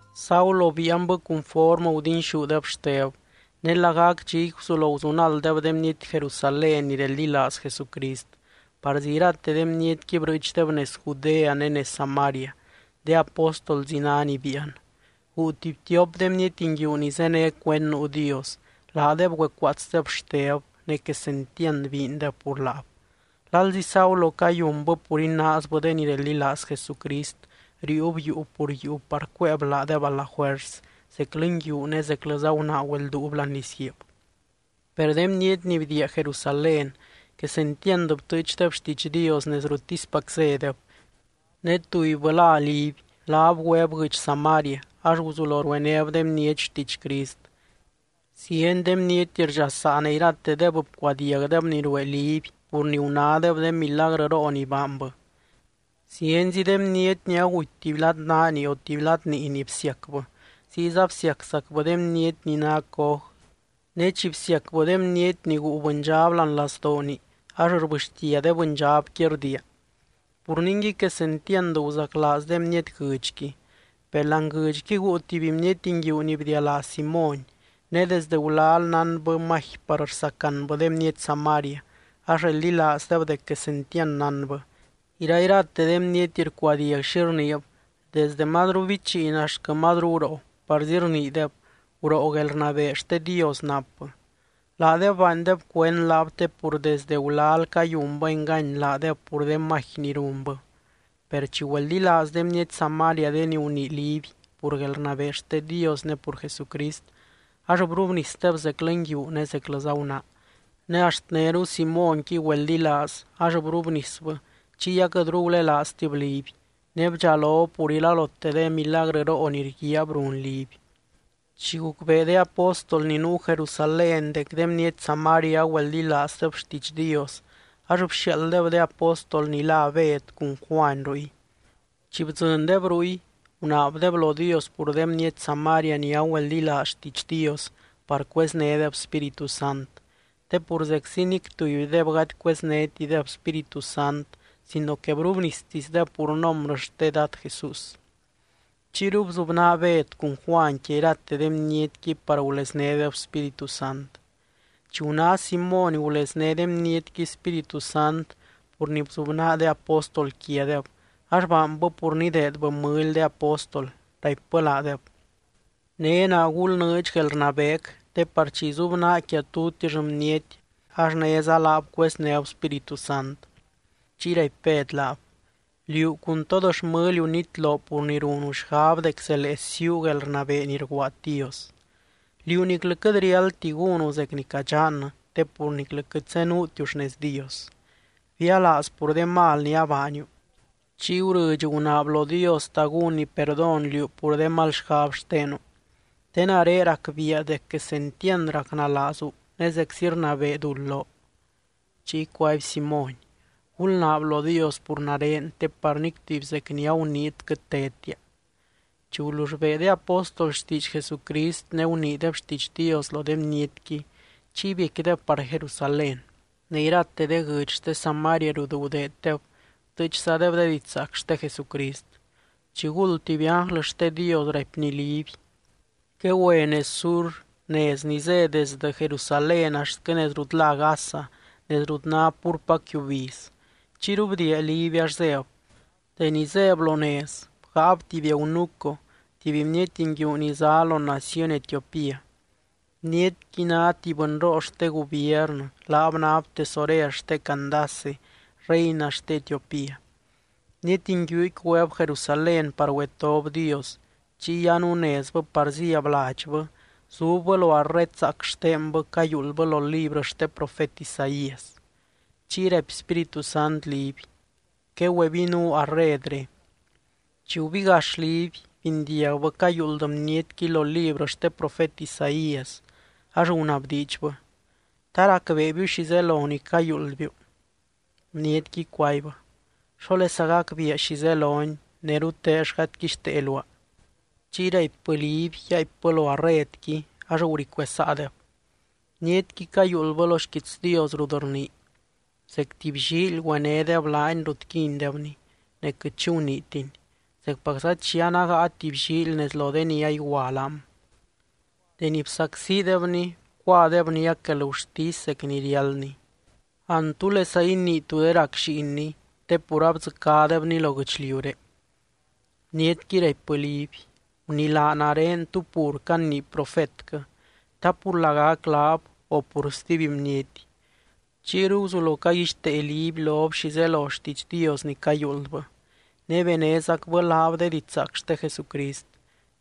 Saulo biianbɨ cunformɨ gudinxúdeb Xteb. Ne lagac dxiqui, guzulo guzunalddeb de bniety Jerusalén ni reldilaaz Jesucrist, parzi irate de bnietqui brɨɨchdeb nez Judea ne nez Samaria. De apóstolzi ná ni biian. Guu tuby tiop de bniety nguiu ni zéne cuend nuu Dios, laadeb güecuaatsdeb Xteb, ne quesentiand biindeb pur laab. Lalzi Saulo cayunbɨ pur inaazbɨ de ni reldilaaz Jesucrist, riiub yuu pur yuu par cuéeb laadeb a la juers, zeclɨ nguiu ne zeclɨza gunaa güelduub láani lizguiib. Per de bniety ni bdiia Jerusalén quesentiand btɨɨchdeb xtiidx Dios nez ruttispac zédeb. Ne tubybɨ lá Liby, laab güeb guɨdx Samaria, ax guzulo ruenéb de bniety xtiidx Crist. Zieny de bniety rdxasaa ne iratedeb bcuadiagdeb ni ruee Liby pur ni gunádeb de milagrɨroo ni baanbɨ. Zienzi de bniety ni aguty tuby lad naani o tuby lad niini bsiacbɨ, ziyza bsiaczacbɨ de bniety ni ná coj, ne chi bsiacbɨ de bniety ni guu bɨndxab láani lazdooni, ax rbɨxtia de bɨndxabqui rdiia. Pur ningui, quesentiand guzaclaaz de bniety guɨdxqui. Per láani guɨdxqui guu tuby bniety nguiu ni bdialá Simóny. Ne desde gulal nánbɨ magi par rsacanbɨ de bniety Samaria, ax reldilaazdeb dec quesentiand nánbɨ. Irairate de bniety rcuadiag xi rniib, desdɨ mazru bichiin axtquɨ mazru guroo, parzi rniideb: —Guroo guelrnabee xte Dios napbɨ. Laadeb baandeb cuend laab te pur desde gulal cayunbɨ engany laadeb pur de magi ni runbɨ. Per chi güeldilaaz de bniety Samaria de ni gunii Liby pur guelrnabee xte Dios ne pur Jesucrist, ax brubnisdeb zeclɨ nguiu ne zeclɨza gunaa. Ne axt néru Simónqui güeldilaaz, ax brubnisbɨ chiy aquɨtru gulelaaztib Liby. Ne bdxalob pur iralote de milagrɨroo ni rguiaab run Liby. Chi gucbee de apóstol ni nuu Jerusalén dec de bniety Samaria agüeldilaazdeb xtiidx Dios, ax bxiaalddeb de apóstol ni lá Bed cun Juany ruy. Chi bdzɨndeb ruy, gunaabdeb lo Dios pur de bniety Samaria ni agüeldilaaz xtiidx Dios par cueznédeb Spíritu Sant. Te pur zeczi nic tubydeb gady cueznétideb Spíritu Sant, sino que brubnistisdeb pur nombrɨ xte Dad Jesús. Chiyru bzubnaa Bed cun Juany quia irate de bnietqui par guleznédeb Spíritu Sant. Chi guná Simóny gulezné de bnietqui Spíritu Sant pur ni bzubnaa de apóstol quiadeb, ax baanbɨ pur nideedbɨ mɨly de apóstol, raipbɨ laadeb: —Né naa gulnɨɨdx guelrnabeec te par chi izubnaa quia tutix bniety, ax néza laab cueznéb Spíritu Sant. Chiy raipy Bed laab: —Liú cun tod xmɨliu nitlo pur ni runu xgab dec zelee siiu guelrnabee ni rguaad Dios. Liú niclɨ quɨt riáldti gúnu zec ni cadxannɨ, te pur niclɨ quɨt zenuutiu xnez Dios. Bialaaz pur de mal ni abaaniu. Chiy gurɨdx gunaab lo Dios ta gúnny perdón liú pur de mal xgab xtenu. Te nare racbiia dec quesentiand racnalaazu, ne zeczi rnabee duld loo. Chiy cuaby Simóny: —Gulnaab lo Dios pur nare, te par nic tuby zec ni aguniit quɨt tedtia. Chi gulull bee de apóstol xtiidx Jesucrist, ne guniideb xtiidx Dios lo de bnietqui, chiy biecquideb par Jerusalén. Ne irate de guɨdx xte Samaria rut gudeeddeb, btɨɨchzadeb de didxzaac xte Jesucrist. Chiguld, tuby ánglɨ xte Dios raipny Liby: —Quegüe nez sur, nez ni zé desdɨ Jerusalén axtquɨ nez rut lá Gaza, nez rut ná púrpac yiubiz. Chiyru bdiia Liby ax zéb. Deni zéb lo nez, bgáab tuby eunuco, tuby bniety nguiu ni zá lo naciony Etiopía. Bnietqui ná tuby bɨnroo xte gubiernɨ, laab náb tesorer xte Candace, reina xte Etiopía. Bniety nguiuqui güeb Jerusalén par güetob Dios. Chiy anunezbɨ par zíab ladxbɨ, zubbɨ lo arred zaac xtenbɨ cayuuldbɨ lo librɨ xte profet Isaías. Chiy raipy Spíritu Sant Liby: —Quegüebinuu arredre. Chi gubigax Liby, bindiagbɨ cayuuld bnietqui lo librɨ xte profet Isaías, ax gunabdiidxbɨ: —¿Ta racbeebiu xi zelo ni cayuuldbiu? Bnietqui cuaibbɨ: —¿Xólesa gacbiia xi zeloni, ne rutell gady quixtee luaa? Chiy raipbɨ Liby yaaipbɨ lo arredqui, ax guri cuesaadeb. Bnietqui cayuuldbɨ lo xquiits Dios rut rnii: Zec tuby llíily, güenédeb laany rut quindebny. Ne quɨt xi guniitiny, zecpacza chi anágaa tuby llíily nez lo de ni aigua laam. Deni bsacsidebny, bcuadeb niac guelgurtisy zec ni riáldny. An, ¿túlesa inii tú de rac lliinny? Te pur abdzɨcádebny lo guɨchliuré. Bnietqui raipbɨ Liby: —Gunilaa nare, ¿tú pur canii profetquɨ? ¿Ta pur lagac laab, o pur stuby bniety? Chiyru guzulo caguixtee Liby lob xi zelo xtiidx Dios ni cayuuldbɨ. Ne benézacbɨ laab de didxzaac xte Jesucrist.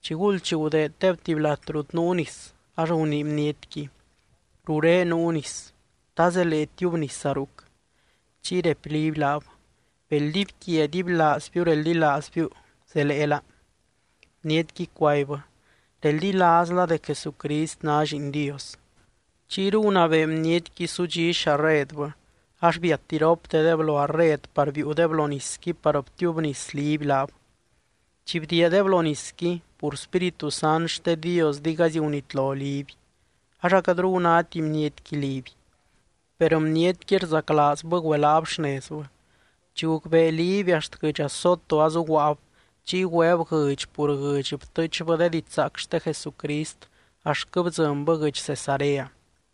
Chiguld chi gudeeddeb tuby lat rut nuu nis, ax gunii bnietqui: —Ruré nuu nis. ¿Ta zelee tiubnisa ruc? Chiy raipy Liby laab: —Bel dibyquia dibylaazbiu reldilaazbiu, zeleela. Bnietqui cuaibbɨ: —Reldilaazla dec Jesucrist ná Lliin Dios. Chiyru gunabee bnietqui sudxí xarredbɨ. Ax biat iroptedeb lo arred par biiudeb lo nisqui par btiubnis Liby laab. Chi bdiiadeb lo nisqui, pur Spíritu Sant xte Dios digaizy gunitlo Liby, ax aquɨtru gunáti bnietqui Liby. Per bnietqui rzaclaazbɨ güelaab xnezbɨ. Chi gucbee Liby axt guɨdx Azoto azuguaab. Chiy güeb guɨdx pur guɨdx btɨɨchbɨ de didxzaac xte Jesucrist axtquɨ bdzɨnbɨ guɨdx Cesarea.